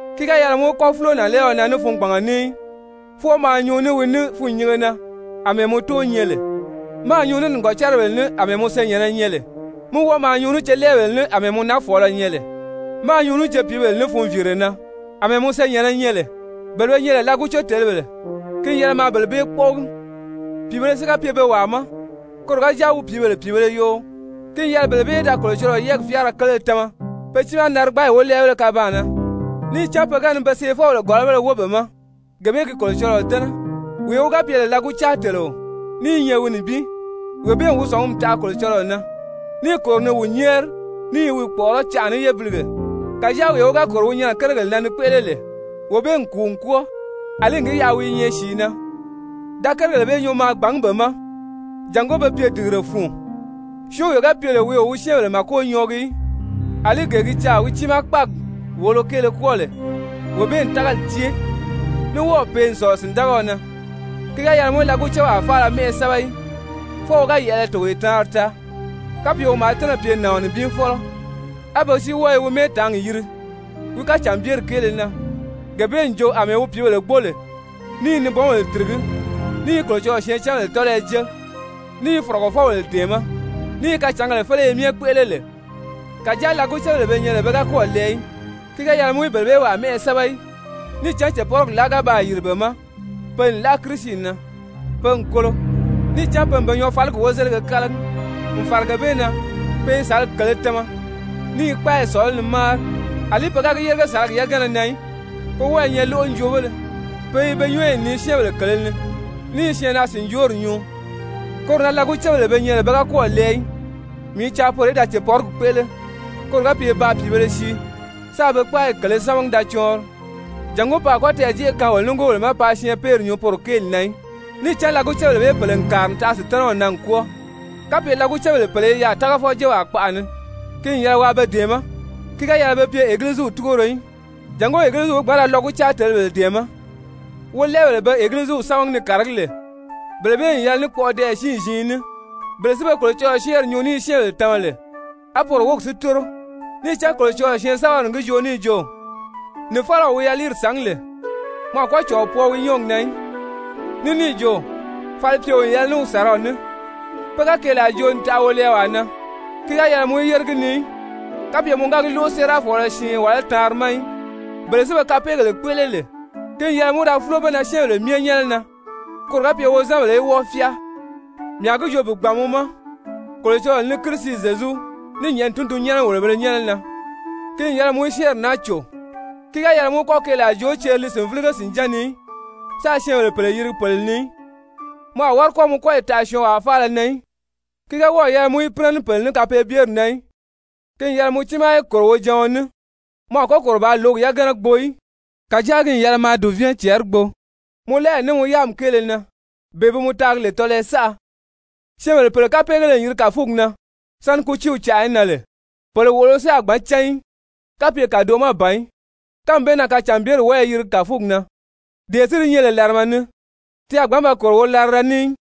Ki ga yɛlɛ mɔ í kɔ́ fúlo nànlɛɛɔ na ní fungbanga ní í, fwɔɔ maa nyuu ní wi ní fûnnyinge na àmɛɛ mɔ tóo nyɛ lè, máā nyuu ní nìgɔcaribèle ní àmɛɛ mɔ senyɛ̀nnɛ nyɛ lè, mí wɔ́ɔ maa nyuu ní celɛɛbèle ní àmɛɛ mɔ nafɔɔlɔ nyɛ lè, máā nyuu ní cepiibèle ní funviire na àmɛɛ mɔ senyɛ̀nnɛ nyɛ lè. Bele be nyɛ lè lɔgucetelebèle, ki n yɛlɛ maa bele bee kpɔ́ʔɔgi. Pìibēle si ga pye pe wàa ma, koro ga jáa wi pìíbèle pìibēle yoo, ki n yɛlɛ bele bee í da Kolocɔlɔɔ yɛ́ɛgi fyáara kele tama pe tiimaa narigbaagi wólɛɛbéle kabaan na, níì cán pe ga ni pe seefɔbèle gɔ̀lɔbéle wóo be ma, gee bee gi Kolocɔlɔɔ dɛ́nɛ. Wee wi ga pye lè lɔgucaateleo ní i nyɛ wi nibin, wee bee n wi sɔ̀ngumi taʔa Kolocɔlɔɔ na, níì kòro ni wi nyɛ́ɛri, ní i wi kpɔ̀ʔɔrɔ́ canʔa ní yébilige. Kàjáa wee wi ga kòro wi nyɛnɛ kérigèle na ni kpéʔele lè, wee bee n kùu n kwɔ́ɔ àlí n gi yaʔa wi i nyɛ sìi na. Da kérigèle bee nyuu maa gbàngí be ma jàngó be pye dìgire fun. Syɔ́ɔnwee ga pye lè wi o wi syɛ́ɛnbèle màko nyɔɔgi í, àlí gee gi caà wi tiimaa kpáagi wòolo kéele kwɔ́ɔ lè, wee bee n tágali cée, ní wɔ́ɔ̀ pee n sɔ̀lɔ sìndagaɔ na. Ki ga yɛlɛ mɔ í lɔgucewaa faala mɛ́ʔɛ sɛ́bɛ í, fwɔɔ wi ga yɛ̀ʔɛlɛ togoye taanri taa, kapye wi maa tɛ́nɛ̀ pye nàɔn nibin fɔ́lɔ, á be si wɔ́ɔ i wi mɛ́ɛtaangi yiri wi kacànbyeri kéele na, gee bee n jo àmɛɛ wi pìíbèle gbóo lè, ní i nibɔnbèle tìrigí, ní i Kolocɔlɔɔ syɛɛncanbèle tɔ́lɔyɔ jée, ní i fɔ̀rɔgɔfɔbèle dɛ̀ɛmɛ́, ní i kacǎngèle féleye myɛ kpéʔele lè. Kàjáa lɔgucebèle be nyɛ lè, pe ga kɔ́ɔ̀ lɛɛ í, ki ga yɛlɛ mɔ í bele bee wàa mɛ́ʔɛ sɛ́bɛ í, níì cán cèpɔrigi láa ga baa yìri be ma, pe n láʔa Kirisi na, pe n kolo, níì cán pe n be nyɔɔfaligi wozelige kálagi. N fàra gee bee na, pe i sàlagi kèlē tama, ní i kpáayi sɔ̀lɔ́ ni máari. Alí pe ga gi yérige sàlagi yagana na í, pe wɔ́ɔ i nyɛ lóʔonjoobéle, pe i be nyɔ́ɔyi nii syɛ́ɛnbèle kèlē ni, ní i syɛɛnnaa-sìnjoori nyuu. Koro na lɔgucebèle be nyɛ lè pe ga kɔ́ɔ̀ lɛɛ í, mii i caa poro í da cèpɔrigi kpéʔele, koro ga pye paa pìibēle sii, sáā be kpáayi kèlē sámagi da cɔɔnri, jàngó pe a kɔ́ tɛɛ̀jeʔe kaan wolo nigoobèle ma paa syɛɛnpeeri nyuu poro kéeli na í. Níì cán lɔgucebèle bee pèle n kàri n taʔa Sutanaw na n kwɔ́ɔ. Kapye lɔgucebèle pèle i yaà tágafɔjewaa kpaʔa ni, ki n yɛlɛ waa be dɛ̀ɛmɛ́. Ki ga yɛlɛ be pye Egiliziw túgoro í, jàngó Egiliziw í gbǎn ra lɔgucaatelebèle dɛ̀ɛmɛ́. Wolɛɛbèle be Egiliziw sámagi ni kàragí lè, bele bee n yɛlɛ ní kpɔʔɔdɛɛyɛ siin-ziin ní, bele si be Kolocɔlɔɔ syɛ́ɛnri nyuu ní i syɛ́ɛnbèle tama lè, a poro wógi si tóro. Níì cán Kolocɔlɔɔ syɛɛnsɛbɛri n gi joo níì jo: «Nìfalaw wi yaliiri sàngí lè, mɔ a kɔ́ cɔ̀ɔ pwɔɔ wi nyɔ́ɔgi na í,» ní níì jo: «Falipyeo n yɛlɛ ní wi sàraw ní.» Pe ga keelaa joo n taʔa wolɛɛwaa na, ki ga yɛlɛ mɔ í yére gi ni í kapye mɔ ga gi lóʔo séerafɔɔlɔ siin wàlá taanri ma í. Bele si be kapeegèle kpéʔele lè, ki n yɛlɛ mɔ í da fúlo be na syɛ́ɛnbèle myɛ nyɛ́nɛ na, koro ga pye wozanbèle í wɔ́ɔ fyáa. Mii a gi joo bi gbàn mɔ ma, Kolocɔlɔɔ ní Kirisi Zyezu, ní nyɛ̀ʔɛni tundunnyɛnɛ-wòlobēle nyɛ́nɛ na, ki n yɛlɛ mɔ í syɛ́ɛnri naa cò, ki ga yɛlɛ mɔ í kɔ́ keelaa joo ceri li sìnvilige sìnján ni í, sáā syɛ́ɛnbèle pèle yirigi pèle ni í. Mɔ a wári kɔ́ mɔ kɔ́yi taʔa syɔɔnwaa faala na í, ki ga wɔ́ɔ̀ yɛlɛ mɔ í pínɛ ní pèle ní kapeebyeri na í. Ki n yɛlɛ mɔ tíimaa í kòro wojaɔn ní. Mɔ a kɔ́ kòro bàā lǒgi yagana gbo í, kàjáa ki n yɛlɛ maa dùvɛɛn cɛɛri gbo mɔ láayi ní mɔ yáami kéele na bee bi mɔ taagi lè tɔlɔyɔ saʔa. Syɛ́ɛnbèle pèle kapeegéle n yiri kàfugi na sáni kútiiw canʔa í nan lè. Pèle wòʔolo si a gbǎn cán í, kapye kàdoʔo ma ban í. Kánmi bee na kacànbyeri wɔ́ɔ i yirigi kàfugi na, dee si di nyɛ lè làrama ni, ti a gbǎn ba kòro wolarada ni í.